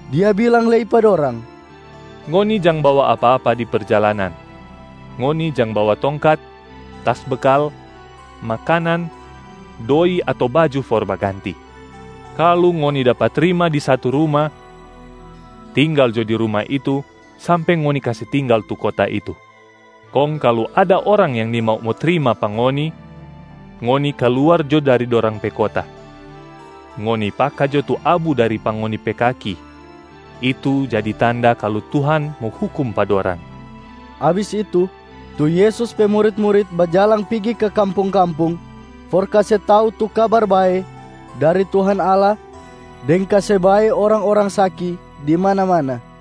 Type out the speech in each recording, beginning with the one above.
Dia bilang lei pa dorang, “Ngoni jang bawa apa-apa di perjalanan. Ngoni jang bawa tongkat, tas bekal, makanan, doi ato baju for baganti. Kalu ngoni dapa trima di satu ruma, tinggal jo di ruma itu sampe ngoni kase tinggal tu kota itu. Kong kalu ada orang yang nimau mo trima pa ngoni, ngoni kaluar jo dari dorang pe kota, ngoni paka jo tu abu dari pa ngoni pe kaki itu jadi tanda kalu Tuhan mo hukum pa dorang.” Abis itu, tu Yesus pe murit-murit bajalang pigi ka kampung-kampung for kase tau tu Kabar Bae dari Tuhan Allah deng kase bae orang-orang saki di mana-mana.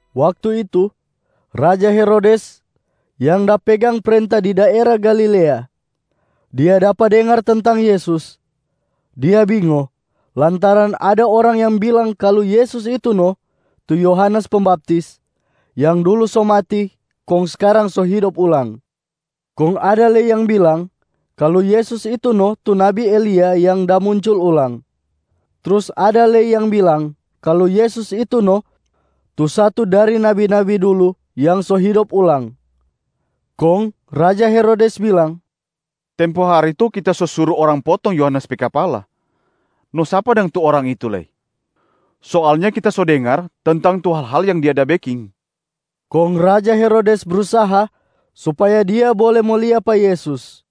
Waktu itu raja Herodes yang da pegang prenta di daera Galilea. Dia dapa dengar tentang Yesus. Dia bingo lantaran ada orang yang bilang kalu Yesus itu no tu Yohanes Pembaptis yang dulu so mati kong skarang so hidop ulang. Kong ada lei yang bilang kalu Yesus itu no tu nabi Elia yang da muncul ulang. Trus ada lei yang bilang kalu Yesus itu no tu satu dari nabi-nabi dulu yang so hidop ulang. Kong raja Herodes bilang, “Tempo hari to kita so suru orang potong Yohanes pe kapala, no sapa dang tu Orang itu lei? Soalnya kita so dengar tentang tu hal-hal yang Dia da beking.” Kong raja Herodes brusaha supaya dia bole mo lia pa Yesus.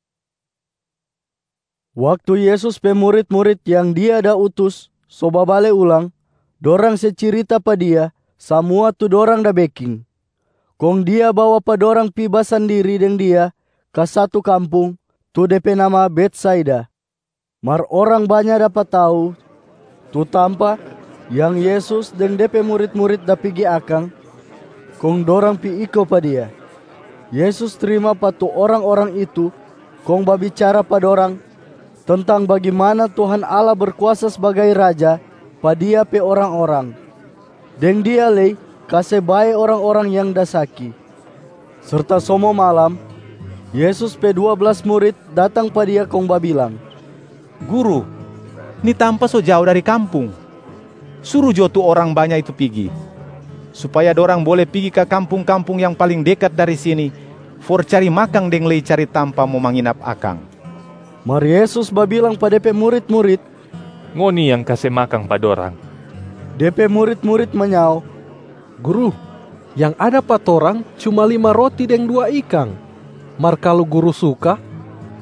Waktu Yesus pe murit-murit yang Dia da utus so babale ulang, dorang se cirita pa Dia samua tu dorang da beking. Kong Dia bawa pa dorang pi basandiri deng Dia ka satu kampung, tu de pe nama Betsaida. Mar orang banya dapa tau tu tampa yang Yesus deng De pe murit-murit da pigi akang, kong dorang pi iko pa Dia. Yesus trima pa tu orang-orang itu kong babicara pa dorang tentang bagimana Tuhan Allah Berkuasa sbagai Raja pa Dia pe orang-orang, deng Dia lei kase bae orang-orang yang da saki. Serta so mo malam, Yesus pe dua blas murit datang pa Dia kong babilang, “Guru, ni tampa so jao dari kampung. Suru jo tu orang banya itu pigi, supaya dorang bole pigi ka kampung-kampung yang paling dekat dari sini for cari makang deng lei cari tampa mo manginap akang.” Mar Yesus babilang pa De pe murit-murit, “Ngoni yang kase makang pa dorang!” De pe murit-murit manyao, “Guru, yang ada pa torang cuma lima roti deng dua ikang, mar kalu Guru suka,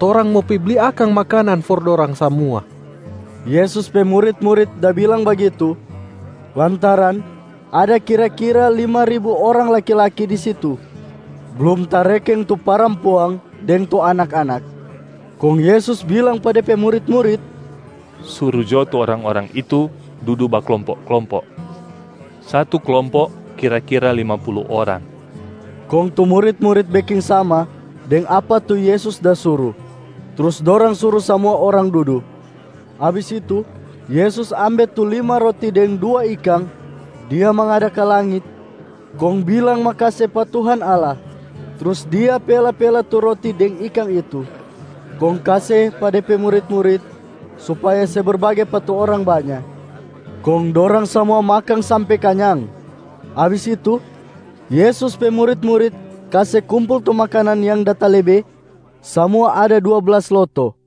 torang mo pi bli akang makanan for dorang samua.” Yesus pe murit-murit da bilang bagitu lantaran ada kira-kira lima ribu orang laki-laki di situ, blum tarekeng tu parampuang deng tu anak-anak. Kong Yesus bilang pa De pe murit-murit, “Suru jo tu orang-orang itu dudu baklompo-klompo, satu klompo kira-kira lima pulu orang.” Kong tu murit-murit beking sama deng apa tu Yesus da suru, trus dorang suru samua orang dudu. Abis itu Yesus ambe tu lima roti deng dua ikang, Dia mangada ka langit kong bilang makase pa Tuhan Allah trus Dia pela-pela tu roti deng ikang itu, kong kase pa De pe murit-murit supaya se berbage pa tu orang banya. Kong dorang samua makang sampe kanyang. Abis itu, Yesus pe murit-murit kase kumpul tu makanan yang da talebe, samua ada dua blas loto.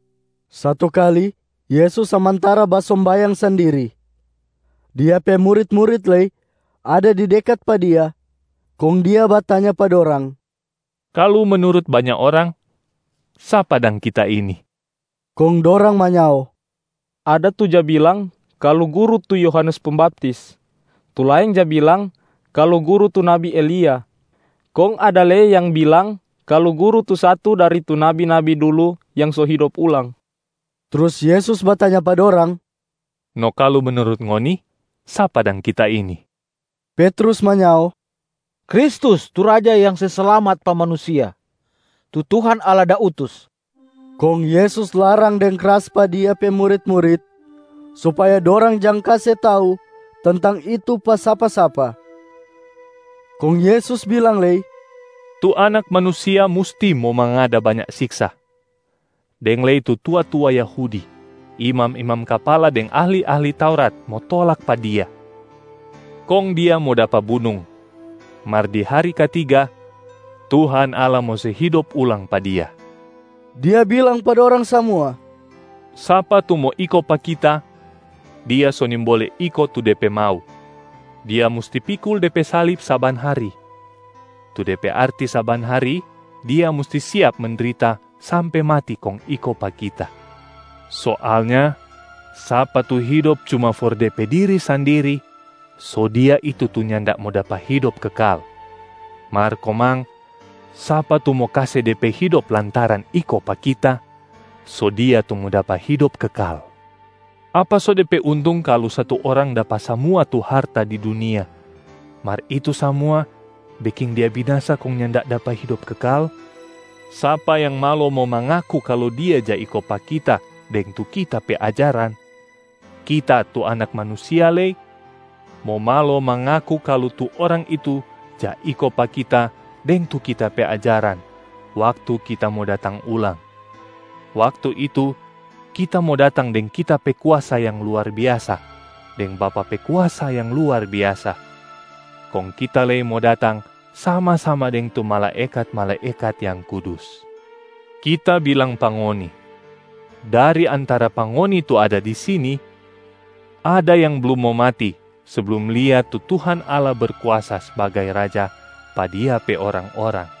Satu kali Yesus samantara basombayang sandiri. Dia pe murit-murit lei ada di dekat pa Dia. Kong Dia batanya pa dorang, “Kalu menurut banya orang, sapa dang Kita ini?” Kong dorang manyao, “Ada tu ja bilang kalu Guru tu Yohanes Pembaptis, tu laeng ja bilang kalu Guru tu nabi Elia, kong ada lei yang bilang kalu Guru tu satu dari tu nabi-nabi dulu yang so hidop ulang.” Trus Yesus batanya pa dorang, “No kalu menurut ngoni, sapa dang Kita ini?” Petrus manyao, “Kristus tu Raja yang se slamat pa manusia, tu Tuhan Allah da utus.” Kong Yesus larang deng kras pa Dia pe murit-murit supaya dorang jang kase tau tentang itu pa sapa-sapa. Kong Yesus bilang lei, “Tu Anak Manusia musti mo mangada banya siksa, deng lei tu tua-tua Yahudi, imam-imam kapala deng ahli-ahli Taurat mo tolak pa Dia. Kong Dia mo dapa bunung, mar di hari katiga Tuhan Allah mo se hidop ulang pa Dia.” Dia bilang pa dorang samua, “Sapa tu mo iko pa Kita, dia so nimbole iko tu de pe mau. Dia musti pikul de pe salib saban hari, tu de pe arti saban hari dia musti siap mendrita sampe mati kong iko pa Kita. Soalnya sapa tu hidop cuma for de pe diri sandiri, so dia itu tu nyanda mo dapa hidop kekal. Mar komang, sapa tu mo kase de pe hidop lantaran iko pa Kita, so dia tu mo dapa hidop kekal. Apa so de pe untung kalu satu orang dapa samua tu harta di dunia, mar itu samua beking dia binasa kong nyanda dapa hidop kekal? Sapa yang malo mo mangaku kalu dia ja iko pa Kita deng tu Kita pe ajaran, Kita tu Anak Manusia lei mo malo mangaku kalu tu orang itu ja iko pa Kita deng tu Kita pe ajaran waktu Kita mo datang ulang. Waktu itu Kita mo datang deng Kita pe kuasa yang luar biasa deng Bapa pe kuasa yang luar biasa, kong Kita lei mo datang sama-sama deng tu malaekat-malaekat yang kudus. Kita bilang pa ngoni, dari antara pa ngoni tu ada di sini, ada yang blum mo mati seblum lia tu Tuhan Allah Berkuasa sbagai Raja pa Dia pe orang-orang.”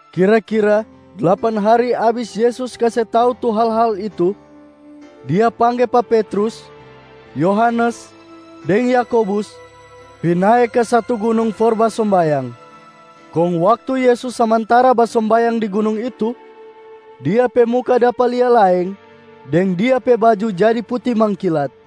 Kira-kira dlapan hari abis Yesus kase tau tu hal-hal itu, Dia pangge pa Petrus, Yohanes deng Yakobus pi nae ka satu gunung for basombayang. Kong waktu Yesus samantara basombayang di gunung itu, Dia pe muka dapa lia laeng deng Dia pe baju jadi puti mangkilat.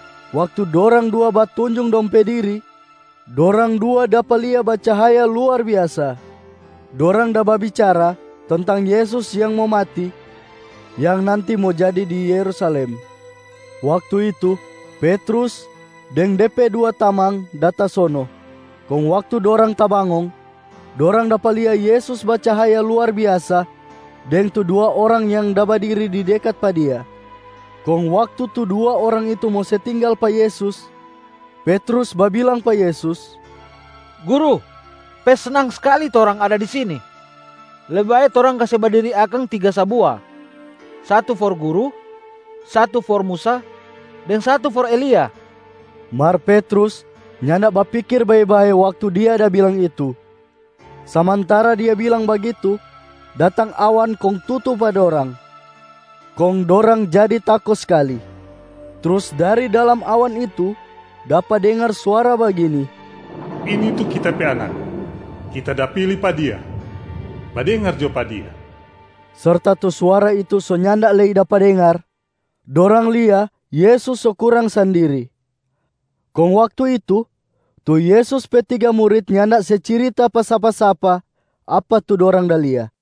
Waktu dorang dua da batunjung dong pe diri, dorang dua dapa lia bacahaya luar biasa. Dorang da babicara tentang Yesus yang mo mati, yang nanti mo jadi di Yerusalem. Waktu itu, Petrus deng de pe dua tamang da tasono. Kong waktu dorang tabangong, dorang dapa lia Yesus bacahaya luar biasa deng tu dua orang yang da badiri di dekat pa Dia. Kong waktu tu dua orang itu mo se tinggal pa Yesus, Petrus babilang pa Yesus, “Guru, pe snang skali torang ada di sini. Lebe bae torang kase badiri akang tiga sabua. Satu for Guru, satu for Musa, deng satu for Elia.” Mar Petrus nyanda bapikir bae-bae waktu dia da bilang itu. Samantara dia bilang bagitu, datang awan kong tutu pa dorang, kong dorang jadi tako skali. Trus dari dalam awan itu dapa dengar suara bagini, “Ini tu Kita pe Anak, Kita da pili pa Dia. Badengar jo pa Dia!” Serta tu suara itu so nyanda lei dapa dengar, dorang lia Yesus so kurang sandiri. Kong waktu itu, tu Yesus pe tiga murit nyanda se cirita pa sapa-sapa apa tu dorang da lia.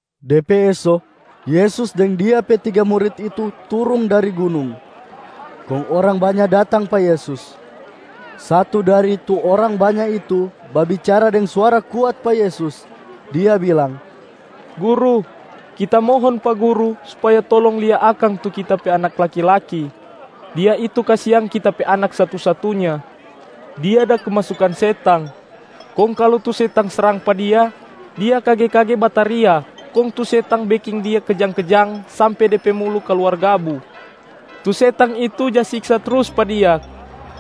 De pe eso, Yesus deng Dia pe tiga murit itu turung dari gunung, kong orang banya datang pa Yesus. Satu dari tu orang banya itu babicara deng suara kuat pa Yesus, dia bilang, “Guru, kita mohon pa Guru supaya tolong lia akang tu kita pe anak laki-laki, dia itu kasiang kita pe anak satu-satunya. Dia da kemasukan setang. Kong kalu tu setang srang pa dia, dia kage-kage bataria kong tu setang beking dia kejang-kejang sampe de pe mulu kaluar gabu. Tu setang itu ja siksa trus pa dia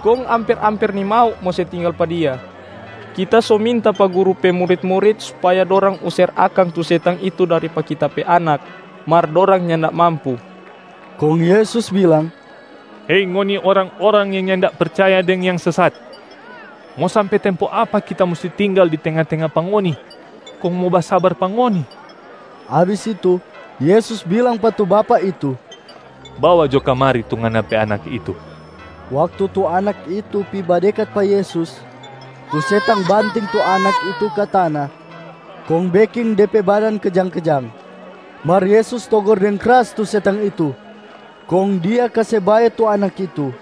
kong amper-amper nimau mo se tinggal pa dia. Kita so minta pa Guru pe murit-murit supaya dorang user akang tu setang itu dari pa kita pe anak, mar dorang nyanda mampu.” Kong Yesus bilang, “Hei ngoni orang-orang yang nyanda percaya deng yang sesat! Mo sampe tempo apa Kita musti tinggal di tenga-tenga pa ngoni, kong mo basabar pa ngoni?” Abis itu Yesus bilang pa tu bapak itu, “Bawa jo kamari tu ngana pe anak itu!” Waktu tu anak itu pi badekat pa Yesus, tu setang banting tu anak itu ka tana kong beking de pe badan kejang-kejang. Mar Yesus togor deng kras tu setang itu kong Dia kase bae tu anak itu.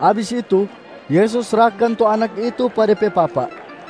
Abis itu Yesus srahkan tu anak itu pa de pe papa.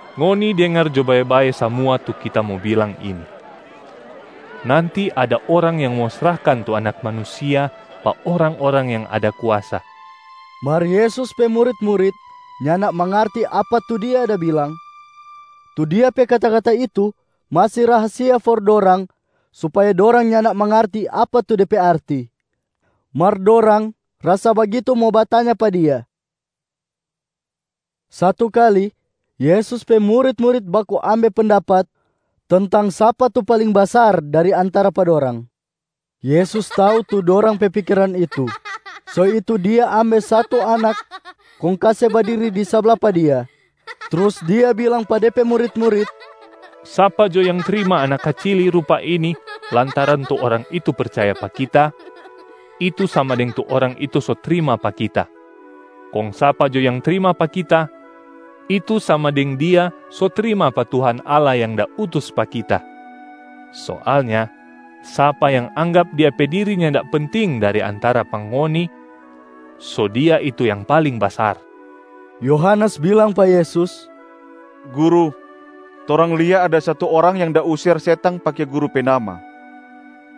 “Ngoni dengar jo bae-bae samua tu Kita mo bilang ini: nanti ada orang yang mo srahkan tu Anak Manusia pa orang-orang yang ada kuasa.” Mar Yesus pe murit-murit nyanda mangarti apa tu Dia da bilang. Tu Dia pe kata-kata itu masi rahasia for dorang supaya dorang nyanda mangarti apa tu de pe arti. Mar dorang rasa bagitu mo batanya pa Dia. Satu kali, Yesus pe murit-murit baku ambe pendapat tentang sapa tu paling basar dari antara pa dorang. Yesus tau tu dorang pe pikiran itu, so itu Dia ambe satu anak kong kase badiri di sabla pa Dia. Trus Dia bilang pa De pe murit-murit, “Sapa jo yang trima anak kacili rupa ini lantaran tu orang itu percaya pa Kita, itu sama deng tu orang itu so trima pa Kita. Kong sapa jo yang trima pa Kita, itu sama deng dia so trima pa Tuhan Allah yang da utus pa Kita. Soalnya sapa yang anggap dia pe diri nyanda penting dari antara pa ngoni, so dia itu yang paling basar.” Yohanes bilang pa Yesus, “Guru, torang lia ada satu orang yang da user setang pake Guru pe nama.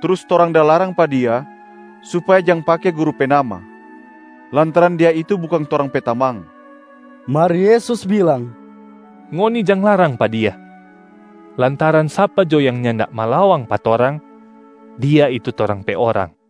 Trus torang da larang pa dia supaya jang pake Guru pe nama, lantaran dia itu bukang torang pe tamang.” Mar Yesus bilang, “Ngoni jang larang pa dia, lantaran sapa jo yang nyanda malawang pa torang, dia itu torang pe orang.”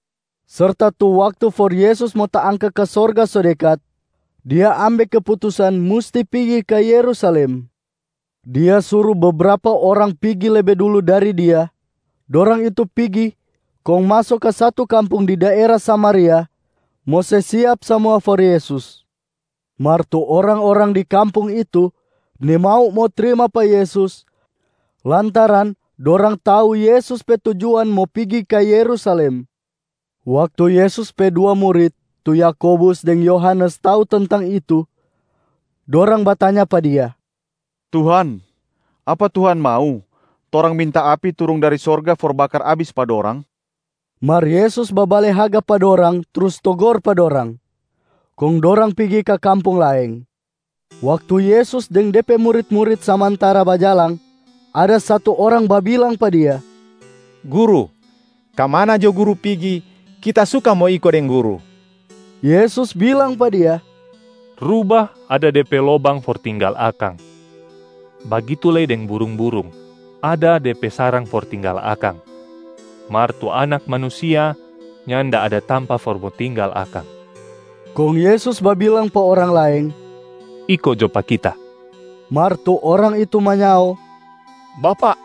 Serta tu waktu for Yesus mo taangka ka sorga so dekat, Dia ambe keputusan musti pigi ka Yerusalem. Dia suru bebrapa orang pigi lebe dulu dari Dia. Dorang itu pigi kong maso ka satu kampung di daera Samaria, mo se siap samua for Yesus. Mar tu orang-orang di kampung itu nimau mo trimaa pa Yesus lantaran dorang tau Yesus pe tujuan mo pigi ka Yerusalem. Waktu Yesus pe dua murit tu Yakobus deng Yohanes tau tentang itu, dorang batanya pa Dia, “Tuhan, apa Tuhan mau, torang minta api turung dari sorga for bakar abis pa dorang?” Mar Yesus babale haga pa dorang trus togor pa dorang. Kong dorang pigi ka kampung laeng. Waktu Yesus deng De pe murit-murit samantara bajalang, ada satu orang babilang pa Dia, “Guru, ka mana jo Guru pigi, kita suka mo iko deng Guru.” Yesus bilang pa dia, “Rubahb ada de pe lobang for tinggal akang, bagitu lei deng burung-burung ada de pe sarang for tinggal akang, mar tu Anak Manusia nyanda ada tampa for mo tinggal akang.” Kong Yesus babilang pa orang laeng, “Iko jo pa Kita!” Mar tu orang itu manyao, “Bapak,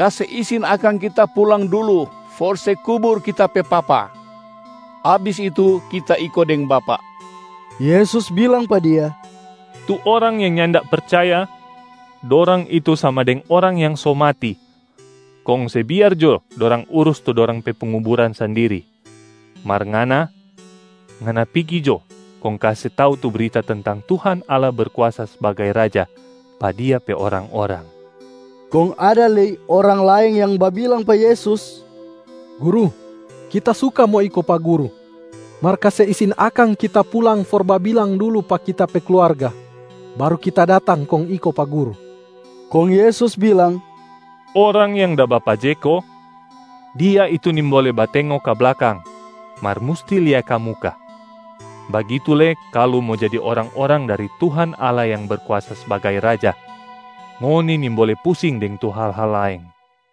kase isin akang kita pulang dulu for se kubur kita pe papa, abis itu kita iko deng Bapak.” Yesus bilang pa dia, “Tu orang yang nyanda percaya, dorang itu sama deng orang yang so mati, kong se biar jo dorang urus tu dorang pe penguburan sandiri. Mar ngana, ngana pigi jo kong kase tau tu brita tentang Tuhan Allah Berkuasa sbagai Raja pa Dia pe orang-orang.” Kong ada lei orang laeng yang babilang pa Yesus, “Guru, kita suka mo iko pa Guru, mar kase isin akang kita pulang for babilang dulu pa kita pe kluarga, baru kita datang kong iko pa Guru.” Kong Yesus bilang, “Orang yang da bapajeko, dia itu nimbole batengo ka blakang mar musti lia ka muka. Bagitu lei kalu mo jadi orang-orang dari Tuhan Allah yang Berkuasa sbagai Raja, ngoni nimbole pusing deng tu hal-hal laeng.”